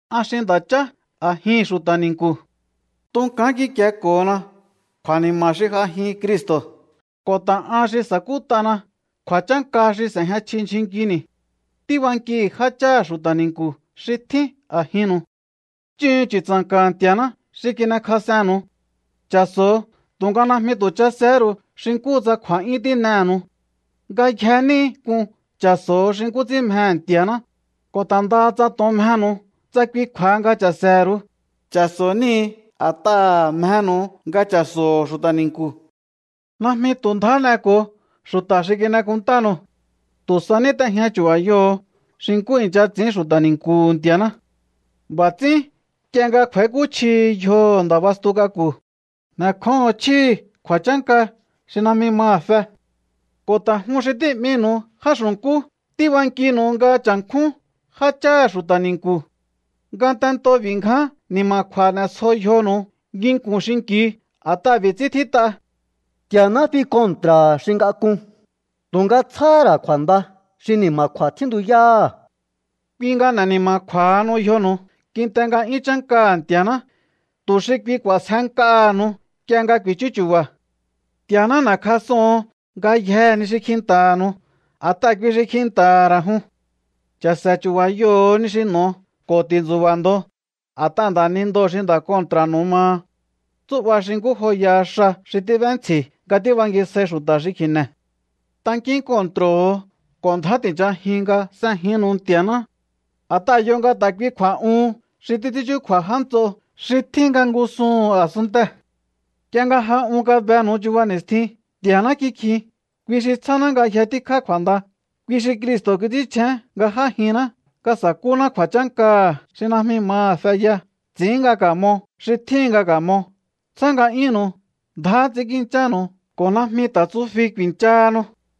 An xi nda̱chá a̱jihi̱n xu̱ta̱ ni̱nku̱. Tunkán kikieko̱hona kju̱a̱ni̱ma̱ha̱ xi j'ajin Cristo̱ ko̱ ta̱ an xi sa̱kút'ana kju̱a̱chánka xi s'e̱jña chji ndyjun nkini̱. Tíbankihi̱ jácháha̱ xu̱ta̱ ni̱nku̱ xi tjín a̱jinnu̱u. Chúhu̱un chu̱tsa̱nka̱ha̱ Nti̱a̱ná xi kin'ekjas'ennu̱u. Cha̱so̱ho̱o, tu̱nga najmi tu̱ chasehé ru̱u xi nkúhu tsa kju̱a̱'yún tín'ehe̱nu̱u. Ngayje níhi k'un cha̱so̱ho̱ xi nkú ts'ín mjehe̱ Nti̱a̱ná. Ko̱ ta̱ ndaha tsa to̱on mjenu̱u, tsa kui kju̱a̱ha nga cha̱se̱he̱ru̱u. Cha̱so̱ níhi̱ a̱t'aha̱ mjenu̱u nga cha̱so̱ho̱ xu̱ta̱ ni̱nku̱. Najmi tu̱ ndjá n'eko̱o xu̱ta̱ xi kin'ekúnntanu̱u. Tu̱ sa ní t'ejña chu̱ba̱yoho̱o xi nkú i̱ncha ts'i̱ín xu̱ta̱ ni̱nku̱hu̱ Nti̱a̱ná. B'a̱ ts'ín nk'ie nga kj'u̱a̱íkúchjihi yjoho̱ Nda̱ bastu k'aku̱, n'e̱kjóho̱on chjíhi̱ kju̱a̱chánka xi najmi maha̱ fe. Ko̱ ta̱ jun xi tí'minu̱u já xu̱nkú, tíbankinu̱u nga cha̱nkjún jácháha̱ xu̱ta̱ ni̱nku̱. Ngatento b'i̱ ngján ni̱ma̱kju̱a̱ n'e̱sjo yjonu̱u nginku̱n xinki̱u, a̱t'aha̱ b'i̱ ts'ín tjít'a: Nti̱a̱ná fi kontra̱ha̱ xi ngak'un, tu̱nga tsjáhá ra̱ kju̱a̱nda xi ni̱ma̱kju̱a̱ tjíntuyáha̱. Kui nga n'e̱ ni̱ma̱kju̱a̱hanu yjonu̱u kinte nga'yún chánkaha̱ Nti̱a̱ná, tu̱ xi kui k'u̱a̱sjenk'aha̱nu̱u nk'ie nga ku̱i̱chú chu̱ba̱. Nti̱a̱ná n'e̱kjas'oho̱on ngayjee̱ ni xi kjinta̱ha̱nu̱u, a̱t'aha̱ kui xi kjinta̱ha̱ ra̱ jun. Cha̱se̱ chu̱ba̱yoho̱o ni xi n'o̱o ko̱ ti̱ntsu̱ba̱ ndo, a̱t'aha̱ nda̱nindoo̱ xi nda̱ kontra̱nu̱ maha. Tsú'ba xi nkú joyaha xa xi tíb'éntsji̱ nga tíbangisjai xu̱ta̱ xi kji̱ne̱. Tankín kontro̱ho̱o ko̱ ndjá ti̱nchajiun nga s'ejinnu̱u Ntia̱ná. A̱t'aha̱ yo nga ta̱ kui kju̱a̱'uhun xi títs'ín chúkju̱a̱ já nts'o xi tjín nga ngúsuhu̱n a̱sunntee̱. Nk'ie nga ja un kabenu̱u chuba ni̱stjin, Nti̱a̱ná kikjin, kui xi tsjáná ngayje tíkjá kju̱a̱nda, kui xi Cristo̱ kits'ínchjén nga j'ájinná nga sa̱kúná kju̱a̱chánkaha̱ xi najmi maha̱ feya, ts'i̱ín nga ka̱mo xi tjíhin nga ka̱mo, tsjá nga'yúnnu̱u, ndjá ts'i̱ínkinchánu̱u ko̱ najmi ta̱ tsufi ku̱i̱nchahanu.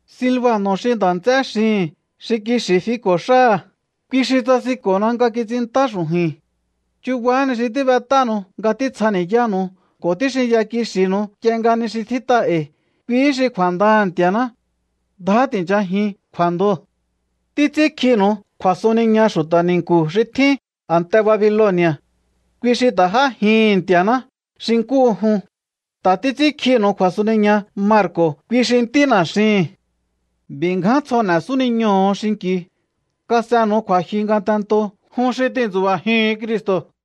Silbano̱ xi nda̱ nts'é xihi̱n, xi kixi̱ fiko̱ xáha̱, kui xi tsasinko̱na nga kits'inntá xu̱ju̱i̱n. Chubahá ni xi tíbet'ánu̱u nga títsjani̱yánu̱u ko̱ tíxinya kixi̱nu̱u nk'ie nga ni xi tjít'a e̱i̱, kuihí xi kju̱a̱ndaha̱ Nti̱a̱ná. Ndjá ti̱nchajiun kju̱a̱ndoo̱. Títs'ínkjinu̱u kju̱a̱suniña xu̱ta̱ ni̱nku̱ xi tjín a̱nte Babiloni̱a̱. Kui xi ta̱ j'ájihi̱n Nti̱a̱ná xi nkúhu jun. Ta̱ títs'ínkjinu̱u kju̱asuniña Marko̱, kui xi ntína̱ xihi̱n. B'i̱ ngján tsjo n'e̱ súniñoho̱o xinki̱u. Kas'enu̱u kju̱a̱jyu ngatento jun xi tintsu̱ba̱jihu̱un Cristo̱.